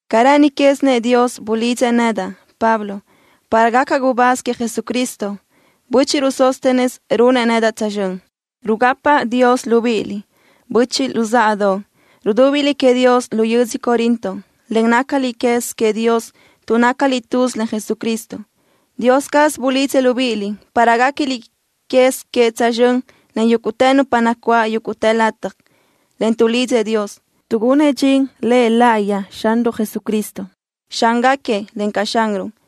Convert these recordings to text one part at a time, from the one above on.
Ca rë́ʼëni quézinëʼ Dios bulidzëʼ nedaʼ, Pablo, para gacaʼ gubáz queëʼ Jesucristo. Bö́chiʼruʼ Sóstenes runëʼ nedaʼ tsözxö́n. Rugapaʼ Dios libíʼiliʼ, böchiʼ luzáʼadoʼ, rudúbiliʼ queëʼ Dios lu yödzö Corinto, en nácaliʼ quez queëʼ Dios tuʼ nácaliʼ tuz len Jesucristo. Dios caz bulidzëʼ libíʼiliʼ para guéquiliʼ quez queëʼ tsözxö́n len yúguʼtë nupa nacuáʼ yúguʼtë lataj, en tuʼlidzëʼ Dios, tuʼgunëʼ dxin La laʼayi queëʼ Xanruʼ Jesucristo, Xángaquiëʼ, encaʼ Xanruʼ.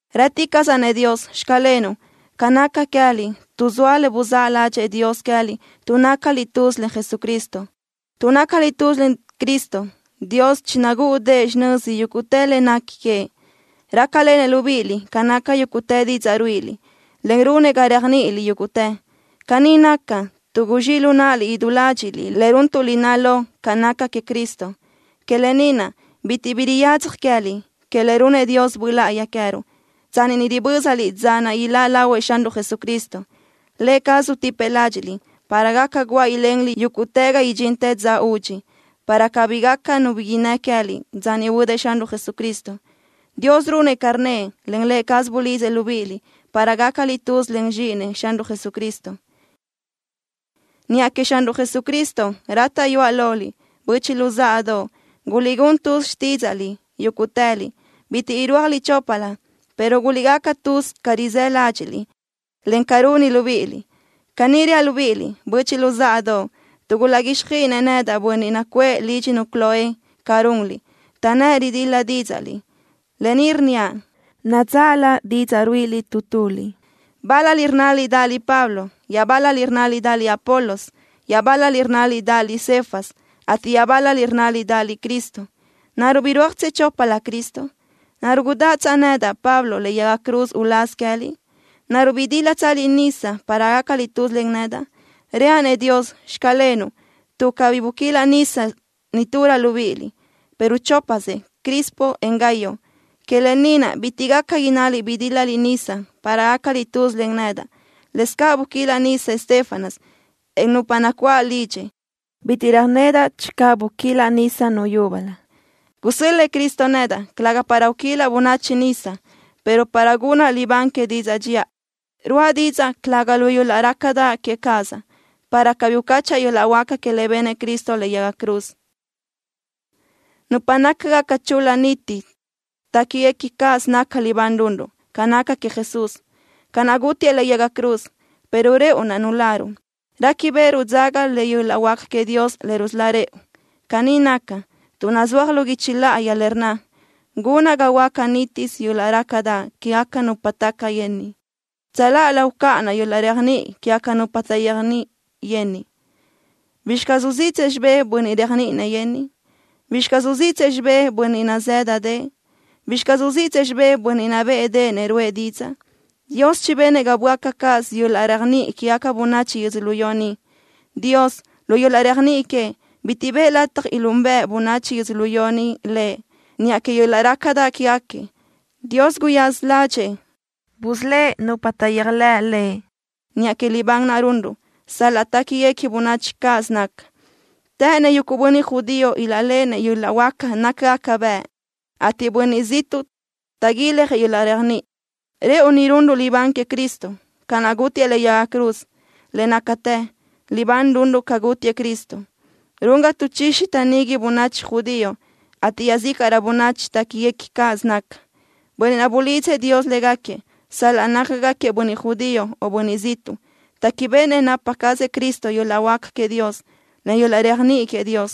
Rë́ticaʼsaʼ-nëʼ Dios: “Xclenuʼ” ca naca queë́liʼ, tuʼ zoa le buzáʼ ládxëʼë Dios queë́liʼ tuʼ nácaliʼ tuz len Jesucristo. Tuʼ nácaliʼ tuz len Cristo, Dios chinagúʼudëʼë xinö́ziliʼ yúguʼtë le nequi queëʼ. Rácalenëʼ libíʼiliʼ ca naca yúguʼtë didzaʼ ruíʼiliʼ, en runëʼ ga réajniʼiliʼ yúguʼtë. Caní naca, tuʼ guzxíʼ lu náʼaliʼ idú ládxiʼliʼ le runtuʼ lináʼ lo ca naca queëʼ Cristo. Que lë ni naʼ, bitiʼ bi riyadzaj queë́liʼ que le runnëʼ Dios Böʼ Láʼayi queë́ruʼ, tsanni ni ribö́zaliʼ dza naʼ iláʼ lahuëʼ Xanruʼ Jesucristo. Lë cazëʼ utipëʼ ládxiʼliʼ para gaca guáʼ ilenliʼ yúguʼtë ga idxintë dza údxi, para cabí gaca nu bi innë́ queë́liʼ dza niʼ huödëʼ Xanruʼ Jesucristo. Dios runëʼ ca rnnëʼ, en Lë cazëʼ bulidzëʼ libíʼiliʼ para gácaliʼ tuz len Zxíʼinëʼ, Xanruʼ Jesucristo. Niʼa queëʼ Xanruʼ Jesucristo rátaʼyuaʼ loliʼ, böchiʼ luzáʼadoʼ, guliʼgún tuz xtídzaʼliʼ yúguʼtëliʼ. Bitiʼ irúajliʼ choplö, pero guliʼgaca tuz ca rizáʼ ládxiʼliʼ, en ca runi libíʼiliʼ. Caní reaʼ libíʼiliʼ, böchiʼ luzáʼadoʼ, tuʼ gulaʼguíxjöiʼinëʼ nedaʼ bönniʼ nacuʼë lídxinu Cloé ca runliʼ, taʼnnë́ʼ ridil-la dídzaʼliʼ. Lë ni rnníaʼ: Nadzáʼlö didzaʼ ruíʼiliʼ tu tuliʼ. Bál-laliʼ rnnaliʼ dáʼaliʼ Pablo. Iaʼbál-laliʼ rnnaliʼ dáʼaliʼ Apolos. Iaʼbál-laliʼ rnnaliʼ dáʼaliʼ Cefas, ateʼ iaʼbál-laliʼ rnnaliʼ dáʼaliʼ Cristo. ¿Naruʼ birúajtsëʼ choplö Cristo? ¿Naruʼ gudáʼatsaʼ nedaʼ, Pablo, lëʼe yaga cruz uláz queë́liʼ? ¿Naruʼ bidílatsaliʼ nisa para gácaliʼ tuz len nedaʼ? Reaʼ-nëʼ Dios: “Xclenuʼ”, tuʼ cabí buquilaʼ nisa niturö libíʼiliʼ, pero chópasëʼ Crispo, en Gayo. Que lë ni naʼ bitiʼ gaca innaliʼ bidílaliʼ nisa para gácaliʼ tuz len nedaʼ. Lëscaʼ buquilaʼ nisa Estéfanas, en nupa nacuáʼ lidxëʼ. Bitiʼ röjnedaʼ channö buquilaʼ nisa nu yúbölö. Gusö́l-lëʼë Cristo nedaʼ, calëga para uquilaʼ bönachi nisa, pero para gunaʼ libán que didzaʼ dxiʼa. Ruʼa didzaʼ, calëga lu yöl-laʼ rácadaʼ que cazaʼ, para cabí ucáchaʼa yöl-laʼ huáca que le benëʼ Cristo lëʼe yaga cruz. Nupa nácagaca chul-la niti téquiguequi cáʼasö naca libán runruʼ ca naca queëʼ Jesús, ca naʼ gútiëʼ lëʼe yaga cruz, pero rëʼu naʼ nuláruʼ, réquibeʼeruʼ dzaga le yöl-laʼ huáca queëʼ Dios le rusölá rëʼu. Caní naca, tuʼ nazúaj lu guichi láʼayi le rnna: Gunaʼ ga huöáca nítisö yöl-laʼ rácadaʼ quégaca nupa taca yenniʼ. Tsöláʼalö ucáʼanaʼ yöl-laʼ réajniʼi quégaca nupa taʼyéajniʼi yenniʼ. ¿Bizxi caz uziʼtsëʼ xibé bönniʼ réajniʼinëʼ yenniʼ? ¿Bizxi caz uziʼtsëʼ xibé bönniʼ nazë́dadëʼë? ¿Bizxi caz uziʼtsëʼ xibé bönniʼ nabéʼedeʼenëʼ ruʼë didzaʼ? Dios chibenëʼ ga böáca cáʼasö yöl-laʼ réajniʼi quégaca bönachi yödzölió ni. Dios, lu yöl-laʼ réajniʼi queëʼ, bitiʼ bëʼë lataj ilúnbeʼe bönachi yödzölió ni Lëʼ niʼa que yöl-laʼ rácadaʼ quégaquiëʼ. Dios guyaza ládxëʼë busölë́ʼ nupa taʼyéajlëʼ Lëʼ niʼa que libán naʼ runruʼ, sal-laʼ téquiguequi bönachi cáʼasö naca. Të́ʼënnëʼ yuguʼ bönniʼ judío ilaʼléʼenëʼ yöl-laʼ huáca nácagaca bëʼ, ateʼ bönniʼ ziʼtuʼ taʼguiljëʼ yöl-laʼ réajniʼi. Rëʼu ni runruʼ libán queëʼ Cristo, ca naʼ gútiëʼ lëʼe yaga cruz. Le nácatë, libán runruʼ ca gútiëʼ Cristo, run ga taʼchixi taʼnigui bönachi judío, ateʼ iaʼzícaʼrö bönachi téquiguequi cáʼasö naca. Bönniʼ naʼ bulidzëʼ Dios légaquiëʼ, sal-laʼ nácagaquiëʼ bönniʼ judío o bönniʼ ziʼtuʼ, téquibeʼenëʼ napa cazëʼ Cristo yöl-laʼ huáca queëʼ Dios, en yöl-laʼ réajniʼi queëʼ Dios.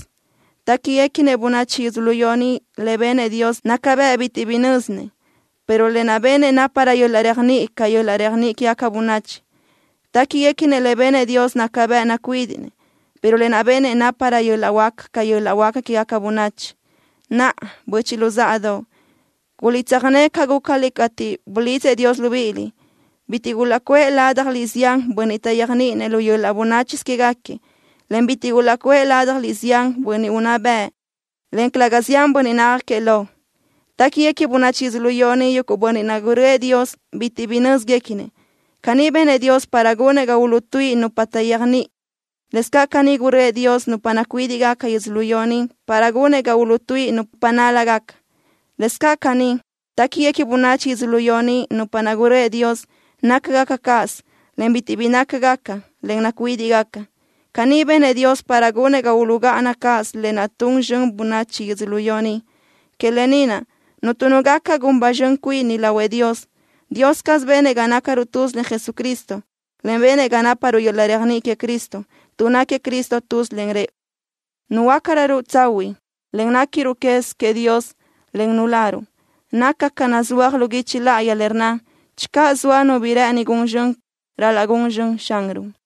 Téquiguequi bönachi yödzölió ni le benëʼ Dios naca bëʼ bitiʼ bi nö́zinëʼ, pero lë naʼ benëʼ náparö yöl-laʼ réajniʼi ca yöl-laʼ réajniʼi quégaca bönachi. Téquiguequi le benëʼ Dios naca bëʼ nacuídiʼnëʼ, pero lë naʼ benëʼ náparö yöl-laʼ huáca ca yöl-laʼ huáca quégaca bönachi. Naʼa, böchiʼ luzáʼadoʼ, guliʼtsöjné ca gúcaliʼ cateʼ bulidzëʼ Dios libíʼiliʼ. Bitiʼ gulaʼcuʼë ládjaliʼ zián bönniʼ taʼyéajniʼinëʼ lu yöl-laʼ bönáchisö quégaquiëʼ, en bitiʼ gulaʼcuʼë ládjaliʼ zián bönniʼ unná bëʼ, en calëga zián bönniʼ nácagaquiëʼ lo. Téquiguequi bönachi yödzölió ni yuguʼ bönniʼ naʼ gurö́ëʼ Dios bitiʼ bi nö́zguequinëʼ. Caní benëʼ Dios para gunëʼ ga uluʼtuíʼi nupa taʼyéajniʼi. Lëscaʼ caní gurö́ëʼ Dios nupa nacuídiʼgaca yödzölió ni para gunëʼ ga uluʼtuíʼi nupa nál-lagaca. Lëscaʼ caní, téquiguequi bönachi yödzölió ni nupa naʼ gurö́ëʼ Dios nácagaca cáʼasö, en bitiʼ bi nácagaca, en nacuídiʼgaca. Caní benëʼ Dios para gunëʼ ga uluʼgáʼana cáʼasö lë naʼ tun zxön bönachi yödzölió ni. Que lë ni naʼ, cuntu nu gaca gun ba zxön cuini lahuëʼ Dios. Dios caz benëʼ ga nácaruʼ tuz len Jesucristo, en benëʼ ga náparuʼ yöl-laʼ réajniʼi queëʼ Cristo. Tuʼ náquiëʼ Cristo tuz len rëʼu, nuhuöácaruʼ tsahuiʼ, en néquiruʼ quez queëʼ Dios, en nuláruʼ. Naca ca naʼ nazúaj lu guichi láʼayi, le rnna: “Channö zoa nu bi rë́ʼëni gun zxön, ral-laʼ gun zxön Xanruʼ.”